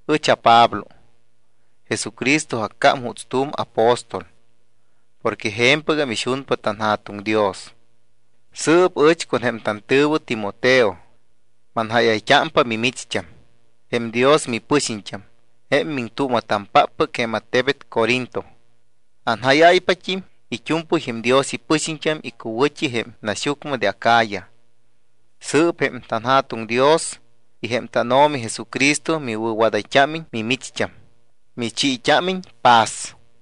Ɨch aPablo. Jesucristo accám juuts tu̱m apóstol porque je̱mpɨgam ixunpa tanJa̱tuŋ Dios. Sɨɨp ɨch con jém tantɨ̱wɨ Timoteo manjáyayt́ámpa mimicht́am, jém Dios mipɨxiñt́am, jém miŋtuuma̱tampáppɨc jém attebet Corinto. Anjáyáypat́im it́u̱mpɨy jém Dios ipɨxiñt́am icuwɨ̱t́i jém naxyucmɨ de Acaya. Sɨɨp jém tanJa̱tuŋ Dios y jém tánO̱mi Jesucristo miwɨ̱wadayt́ámiñ, michiit́ámiñ paz.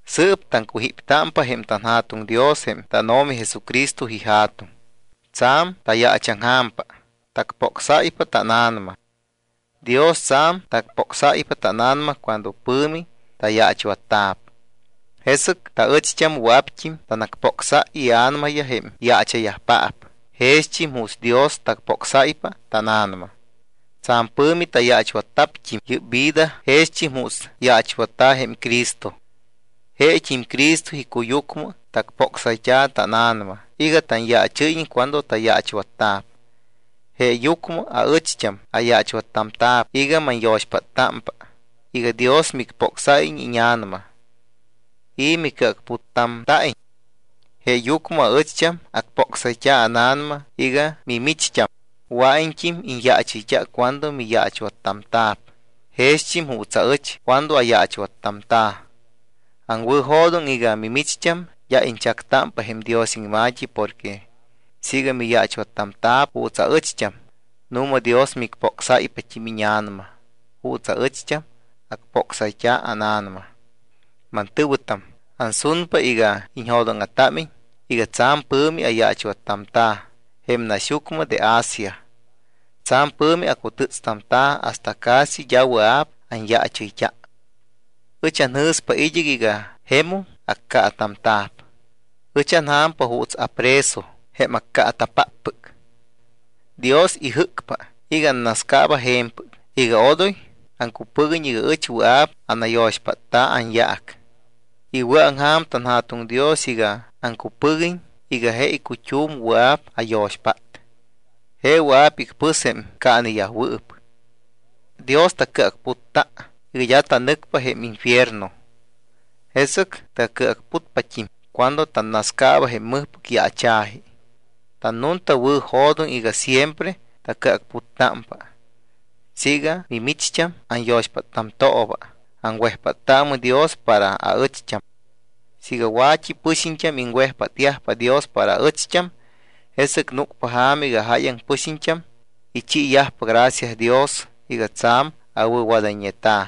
Sɨɨp taŋcujíptámpa jém tanJa̱tuŋ Dios jém tánO̱mi Jesucristo iJa̱tuŋ. Tsa̱m tayaachaŋja̱mpa, tacpocsáypa tána̱nama. Dios tsa̱m tacpocsáypa tána̱nama cuando pɨ̱mi tayaachwatta̱p, jesɨc taɨcht́am wɨa̱pt́im tanacpocsáypa ia̱namayaj jém yaacha̱yajpaap jext́im juuts Dios tacpocsáypa tána̱nama. Tsa̱m pɨ̱mi tayaachwatta̱pt́im yɨ́p vida jext́im juuts yaachwatta̱ jém Cristo. Jesɨc jeet́im Cristo icuyucmɨ tacpocsayt́a̱ tána̱nama iga tanyaachɨ́yiñ cuando tayaachwatta̱p. Jeeyucmɨ aɨcht́am ayaachwattamta̱p iga manyo̱xpáttámpa iga Dios micpocsáyiñ íña̱nama y micɨacputtamta̱iñ. Jeeyucmɨ aɨcht́am acpocsayt́a̱ ána̱nama iga micht́am wɨa̱iñt́im iñyaachɨyt́a cuando miyaachwattamta̱p jext́im juuts aɨcht́am cuando ayaachwattamta̱. Aŋwɨ̱jo̱doŋ iga mimicht́am d́a iñchactámpa jém Dios iŋma̱t́i porque siiga miyaachwattamta̱p juuts aɨcht́am, nu̱ma Dios micpocsáypat́im íña̱nama juuts aɨcht́am acpocsayt́a ána̱nama. Mantɨ̱wɨtam, ansunpa iga iñjo̱dóŋa̱támiñ iga tsa̱m pɨ̱mi ayaachwattamta̱ jém naxyucmɨ de Asia. Tsa̱m pɨ̱mi acutɨ́tstamta̱ hasta casi d́a wɨa̱p anyaachɨyt́a. Ɨch anjɨ̱stámpa id́ɨc iga jemum accaatamta̱p. Ɨch anja̱mpa juuts apreso, jém accaata̱páppɨc. Dios ijɨ́cpa iga annascaaba je̱mpɨc iga odoy aŋcupɨguiñ iga ɨch wɨa̱p anayo̱xpátta̱ anyaac. Iwɨ̱aŋja̱m tanJa̱tuŋ Dios iga aŋcupɨguiñ iga je icut́um wɨa̱p ayo̱xpát, je wɨa̱p icpɨs jém caaneyajwɨɨp. Dios tacɨacputta iga d́a tanɨcpa jém infierno. Jesɨc tacɨacputpat́im cuando tanascaaba jém mɨjpɨc yaacha̱ji. Tannuntawɨ̱jo̱doŋ iga siempre tacɨacputtámpa. Siiga mimicht́am anyo̱xpáttamtooba, aŋwejpáttaamɨ Dios para aɨcht́am. Siiga wa̱t́i pɨxiñt́am iŋwejpátyajpa Dios para aɨcht́am, jesɨc núcpa ja̱ma iga jáyaŋ pɨxiñt́am ichiiyajpa gracia Dios iga tsa̱m awɨ̱wadayñeta.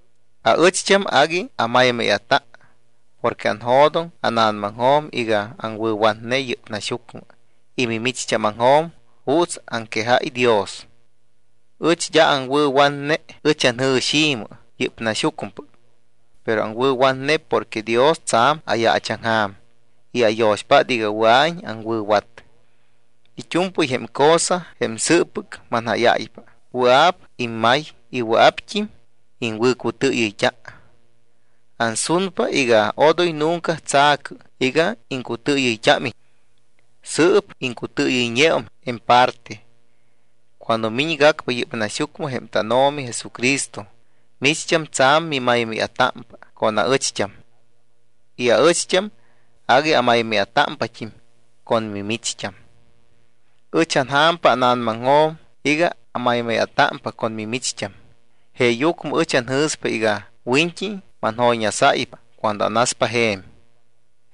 Aɨcht́am agui amaymáya̱ta porque anjo̱doŋ ána̱namaŋjo̱m iga aŋwɨ̱watne yɨ́p naxyucmɨ y mimicht́ámaŋjo̱m juuts aŋquejáy Dios. Ɨch d́a aŋwɨ̱watne ɨch anjɨ̱xi̱mɨ, yɨ́p naxyucmɨpɨc, pero aŋwɨ̱watne porque Dios tsa̱m ayaachaŋja̱m y ayo̱xpát iga wɨa̱iñ aŋwɨ̱wat. It́u̱mpɨy jém cosa, jém sɨɨppɨc manjáyáypa, wɨa̱p immay y wɨa̱pt́im iŋwɨ̱cutɨɨyɨyt́a. Ansunpa iga odoy nunca tsa̱cɨ iga iŋcutɨɨyɨyt́ámiñ. Sɨɨp iŋcutɨɨyɨyñeum en parte. Cuando miñgacpa yɨ́p naxyucmɨ jém tánO̱mi Jesucristo, micht́am tsa̱m mimaymáya̱támpa con aɨcht́am y aɨcht́am agui amaymáya̱támpat́im con micht́am. Ɨch anja̱mpa ána̱namaŋjo̱m iga amaymáya̱támpa con mimicht́am. Jeeyucmɨ ɨch anjɨ̱spa iga wiñt́i manjoyñasáypa cuando anaspa je̱m.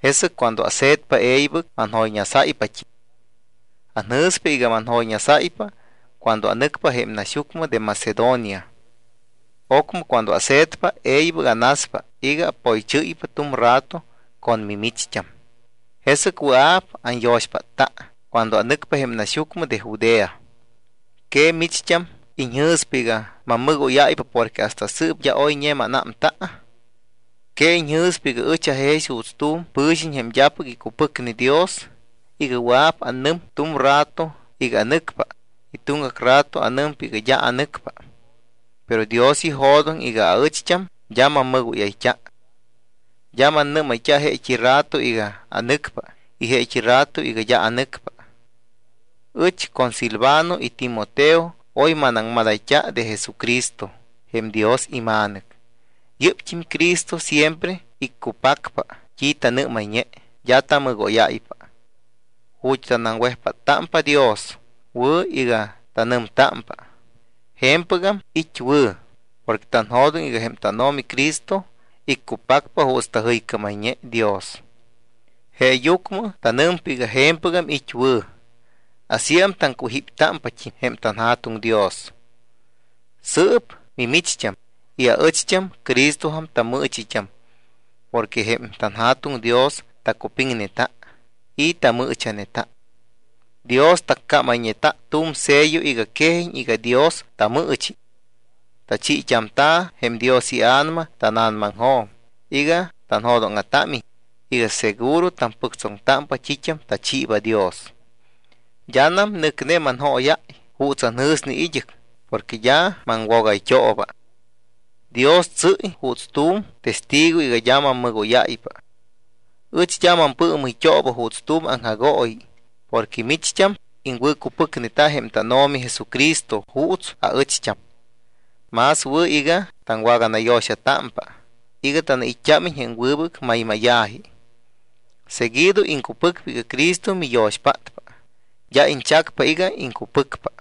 Jesɨc cuando ase̱tpa, e̱ybɨc manjoyñasáypat́im. Anjɨ̱spa iga manjoyñasáypa cuando anɨcpa jém naxyucmɨ de Macedonia. Ocmɨ cuando ase̱tpa, e̱ybɨc anaspa iga apoychɨ́ypa tu̱m rato con mimicht́am, jesɨc wɨa̱p anyo̱xpátta cuando anɨcpa jém naxyucmɨ de Judea. ¿Que micht́am iñjɨ̱spa iga mammɨgóyáypa porque hasta sɨɨp d́a oyñe mánámta? ¿Que iñjɨ̱spa iga ɨch ajex juuts tu̱m pɨ̱xiñ jém d́apɨc icupɨcne Dios iga wɨa̱p anɨm tu̱m rato iga anɨcpa y tuŋgac rato anɨmpa iga d́a anɨcpa? Pero Dios ijo̱doŋ iga aɨcht́am d́a mammɨgóyayt́a, d́a mannɨ́mayt́a jeet́i rato iga anɨcpa y jeet́i rato iga d́a anɨcpa. Ɨch con Silvano y Timoteo oy manaŋmadayt́a de Jesucristo jém Dios iMa̱nɨc. Yɨ́pt́im Cristo siempre iccupacpa t́i tanɨ́mayñe, d́a tamɨgóyáypa. Ju̱t́ tanaŋwejpáttámpa Dios wɨ̱ iga tanɨmtámpa “Je̱mpɨgam it́ wɨ̱” porque tanjo̱doŋ iga jém tánO̱mi Cristo iccupacpa juuts tajɨycámayñe Dios. Jeeyucmɨ tanɨmpa iga “Je̱mpɨgam it́ wɨ̱.” Asíam taŋcujíptámpat́im jém tanJa̱tuŋ Dios. Sɨɨp mimicht́am y aɨcht́am Cristojam tammɨɨchit́am porque jém tanJa̱tuŋ Dios tacupiŋneta y tamɨɨcha̱neta. Dios taccámayñeta̱ tu̱m sello iga quejiñ iga Dios tamɨɨchi. Tachiit́amta̱ jém Dios iA̱nama tána̱namaŋjo̱m iga tanjo̱dóŋa̱támiñ iga seguro tampɨctsoŋtámpa t́it́am tachiiba Dios. D́anam nɨcne manjóyáy juuts anjɨ̱sne id́ɨc porque d́a maŋwogayt́ooba. Dios tsɨ́y juuts tu̱m testigo iga d́a mammɨgóyáypa. Ɨch d́a mampɨɨmɨyt́ooba juuts tu̱m aŋjagooyi porque micht́am iŋwɨ̱cupɨcneta jém tánO̱mi Jesucristo juuts aɨcht́am. Más wɨ̱ iga taŋwaganayo̱xatámpa iga tanait́t́ámiñ jém wɨbɨc maymáya̱ji. Seguido iŋcupɨcpa iga Cristo miyo̱xpátpa, d́a iñchacpa iga iŋcupɨcpa.